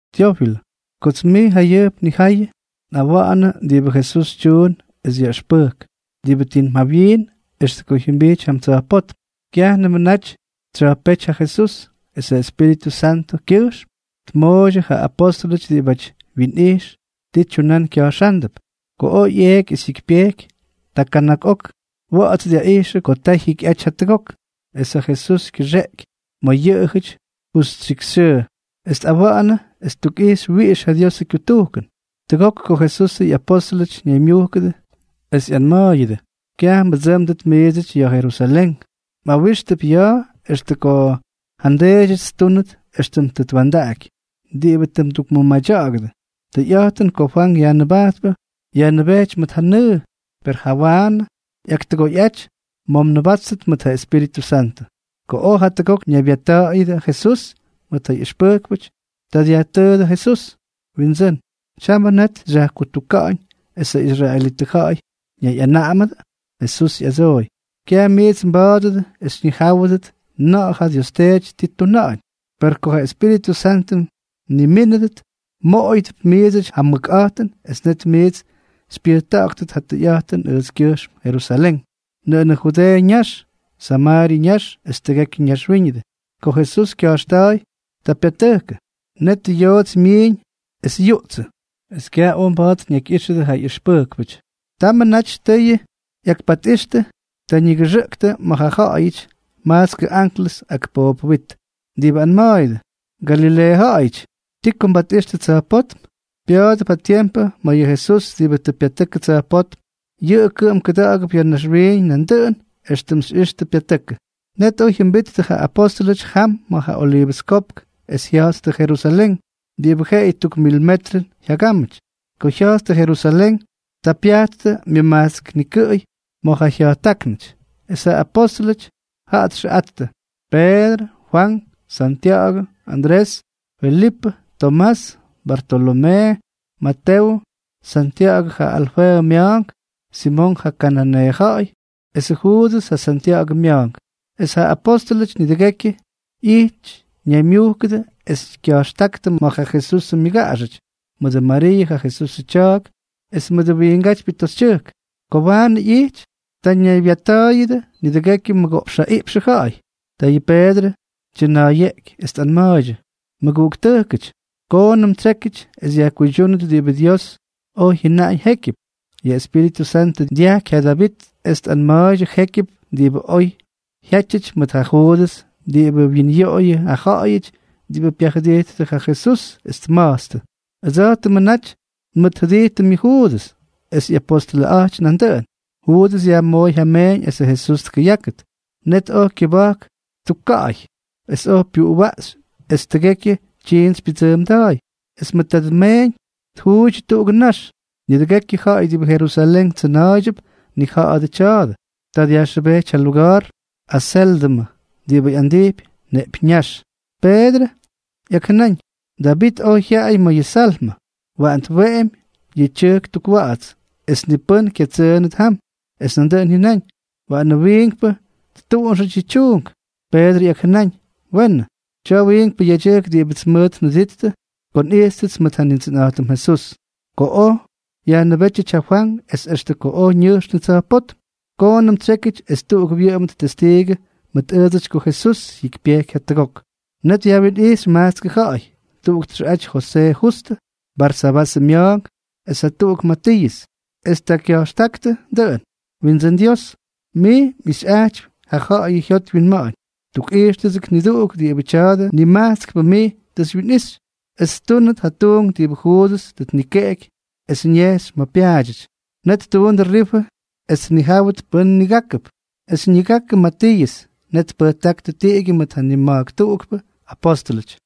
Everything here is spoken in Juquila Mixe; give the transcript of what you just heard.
Tyófilʉ, kots mij jayʉjp nnija̱ꞌa̱yʉ, nꞌawa̱ꞌa̱nʉ diꞌibʉ Jesús tyuun es yaꞌʉxpʉjk, diꞌibʉ tim jawyiin extʉ ko jyʉmbijty jam tsa̱jpótm. Kyajnʉmʉ naty tsya̱jpéty ja Jesús, es Espíritʉ Santʉkyʉjxm tmooydyʉ ja apóstʉlʉty diꞌibʉ wyinꞌijx ti tyunán kya̱jxándʉp. Ko oj ꞌyeeky es jyikypyejky, ta kana̱k ok wa̱ꞌa̱ts dyaꞌijxʉ ko ta jyikyꞌaty jatʉgok, es ja Jesús kyʉxeꞌky ma̱ yʉꞌʉjʉty justyikxyxyʉʉ, es tꞌawa̱ꞌa̱nʉ es ttukꞌixy wiꞌix ja Diosʉ kyutujkʉn. Tʉgok ko Jesusʉ ꞌyapóstʉlʉty ñaymyujkʉdʉ, es tꞌanma̱a̱ydyʉ: —Kyaj mbʉdsʉ́mdʉt miidsʉty ya̱ Jerusalén. Mꞌawíxtʉp ya̱a̱ extʉ ko ja nDeedyʉts ttúnʉt éxtʉm tʉ twa̱ndaꞌaky, diꞌibʉ tʉ ndukmʉmadya̱ꞌa̱ktʉ. Tʉyꞌa̱jtʉn ko Fwank Yajnʉbajtpʉ yajnʉbejty mʉt ja nʉʉ, per jawaanʉ ꞌyaktʉgoyꞌaty ma̱ mnʉbáttʉt mʉt ja Espíritʉ Santʉ. Ko oj jatʉgok ñaybyatta̱ꞌa̱yʉdʉ Jesús mʉt ja ꞌyʉxpʉjkpʉty, ta dyajtʉʉdʉ Jesús: —Windsʉ́n, ¿tyamʉ net xyajkutuka̱ꞌa̱ñ esʉ israelitʉ ja̱ꞌa̱y ñayꞌanaꞌamʉdʉ? Jesús ꞌyadsooy: —Kyaj miits mba̱a̱dʉdʉ es xyñijáwʉdʉt na̱ꞌa̱ ja Dios Teety ti ttuna̱ꞌa̱ñ. Per ko ja Espíritʉ Santʉ mnimínʉdʉt, mmoꞌoyʉdʉp miidsʉty ja mʉkꞌa̱jtʉn es net miits xypyʉjta̱ꞌa̱ktʉt ja tʉyꞌa̱jtʉn ʉjtskyʉjxm Jerusalén, nʉꞌʉnʉ Judeeʉ ñax, Samaaryʉ ñax es tʉgekyʉ naxwíñʉdʉ. Ko Jesús kya̱jxta̱a̱y, ta pyatʉjkʉ. Netʉ yoots myiiñ es yuꞌtsʉ, es kyaj oj mba̱a̱t ñakyꞌíxʉdʉ ja ꞌyʉxpʉjkpʉty. Tamʉ naty tʉyʉ ꞌyakpatꞌixtʉ, ta ñigʉxʉꞌktʉ ma̱ jaꞌajʉty majtskʉ anklʉs, ak poobʉ wyit, diꞌibʉ anma̱a̱yʉdʉ: —Galileeʉ ja̱ꞌa̱yʉty, ¿ti ko mbatꞌixtʉ tsa̱jpótm? Pya̱a̱dʉp ja tiempʉ ma̱ yʉ Jesús diꞌibʉ tʉ pyatʉkʉ tsa̱jpótm, yʉꞌʉ kʉꞌʉm kʉda̱ꞌa̱gʉp ya̱ naxwiiñ nandʉꞌʉn éxtʉm tʉ xyꞌixtʉ pyatʉkʉ. Net oj jyʉmbijttʉ ja apóstʉlʉty jam ma̱ ja Oliivʉs Kopk es jya̱jttʉ Jerusalén, diꞌibʉ jeꞌeyʉ tuk mil metrʉn jyagámʉty. Ko jya̱jttʉ Jerusalén, ta pyajttʉ myʉmajtsk nikʉꞌʉy ma̱ ja jya̱jttáknʉty. Es ja apóstʉlʉty jaꞌa txʉꞌattʉ: Peedrʉ, Fwank, Santya̱ꞌa̱gʉ, Andrés, Felipʉ, Tomás, Bartolomee, Matewʉ, Santya̱ꞌa̱gʉ ja Alfeeʉ mya̱a̱nk, Simonk ja kananeeʉ ja̱ꞌa̱y, esʉ Juudʉs ja Santya̱ꞌa̱gʉ mya̱a̱nk. Es ja apóstʉlʉty nidʉgekyʉ ijty ñaymyúkʉdʉ es kya̱jxta̱ꞌa̱ktʉ mʉt ja Jesusʉ myʉgaꞌaxʉty, mʉdʉ Mariiʉ ja Jesusʉ tya̱a̱k, es mʉdʉ wiingátypyʉ toxytyʉjk. Ko waanʉ ꞌyijty, ta ñaybyatta̱a̱yʉdʉ nidʉgekyʉ mʉgoꞌpx jaꞌiꞌpxʉ ja̱ꞌa̱y. Ta yʉ Peedrʉ tyʉna̱a̱yeꞌky, es tꞌanma̱a̱ydyʉ: —Mʉguꞌuktʉjkʉty, koonʉm tsyékyʉty es yajkuydyúnʉt diꞌibʉ Dios oj jyʉnaꞌañ jékyʉp. Yʉ Espíritʉ Santʉ dyajky ja Davit es tꞌanma̱a̱ydyʉ jékyʉp diꞌibʉ oj jyátyʉty mʉt ja Juudʉs diꞌibʉ wyinyoꞌoyʉ ja ja̱ꞌa̱yʉty diꞌibʉ pyajʉdijttʉ ja Jesús, es tma̱jtstʉ. Ʉdsa̱jtʉmʉ naty nmʉtjʉdijtʉm yʉ Juudʉs, es ꞌyapostʉlʉꞌaty nandʉꞌʉn. Juudʉs yajmooy ja meeñ esʉ Jesús tkʉyákʉt. Net oj kyʉba̱jk ttukka̱ꞌa̱y es oj pyʉjwaꞌxy esʉ tʉgekyʉ tyiints pyʉdsʉʉmda̱a̱y. Es mʉdʉ tadʉ meeñ ttukjuuydyʉ tuꞌugʉ nax. Nidʉgekyʉ ja̱ꞌa̱y diꞌibʉ Jerusalén tsʉna̱a̱ydyʉp tnija̱ꞌa̱dʉ tya̱a̱dʉ. Ta dyajxʉbejty ja luga̱a̱r Aséldʉmʉ (diꞌibʉ andijpy Neꞌpyññáx). Peedrʉ ꞌyakjʉnáñ: Davit oj jyaꞌay ma̱ yʉ Salmʉ: Waꞌan tweꞌemy ja tyʉjk tukwa̱ꞌa̱ts, es ni pʉ́n kyatsʉʉnʉt jam. Es nandʉꞌʉn jyʉnáñ: Waꞌanʉ wiinkpʉ ttuꞌunxʉty yʉ tyuunk. Peedrʉ ꞌyakjʉnáñ: “Weenʉ. Tya̱a̱ wiinkpʉ yedyʉjk diꞌibʉts mʉt njʉdijttʉ ko nꞌijttʉts mʉt ja Nindsʉnꞌa̱jtʉm Jesús, ko oj Jesús yajnʉbétyʉty ja Fwank es extʉ ko oj ñʉjxnʉ tsa̱jpótm. Koonʉm tsyékyʉty es tuꞌuk wyʉꞌʉmʉt testiigʉ mʉt ʉʉdsʉty ko Jesús jyikypyejky jatʉgok.” Net yajwinꞌijxy majtskʉ ja̱ꞌa̱y: tuꞌuk txʉꞌaty Josee Justʉ, Barsabasʉ mya̱a̱nk es jatuꞌuk Matiiʉs. Es ta kya̱jxtáktʉ dʉꞌʉn: —Windsʉ́n Dios, mij mꞌixyꞌajtypy ja ja̱ꞌa̱yʉ jyot wyinma̱ꞌa̱ñ. Tukꞌijxkʉts niduꞌuk diꞌibʉ tya̱dʉ nimajtskpʉ mij tʉ xywyinꞌixy es ttúnʉt ja tuunk diꞌibʉ Juudʉs tʉ tnikeꞌeky es ñejxy ma̱ pyaadyʉty. Net ttuundʉ rifʉ es tnijáwʉt pʉ́n nigákʉp, es ñigakʉ Matiiʉs. Net tpʉjtáktʉ tiꞌigyʉ mʉt ja nima̱jk tuꞌukpʉ apóstʉlʉty.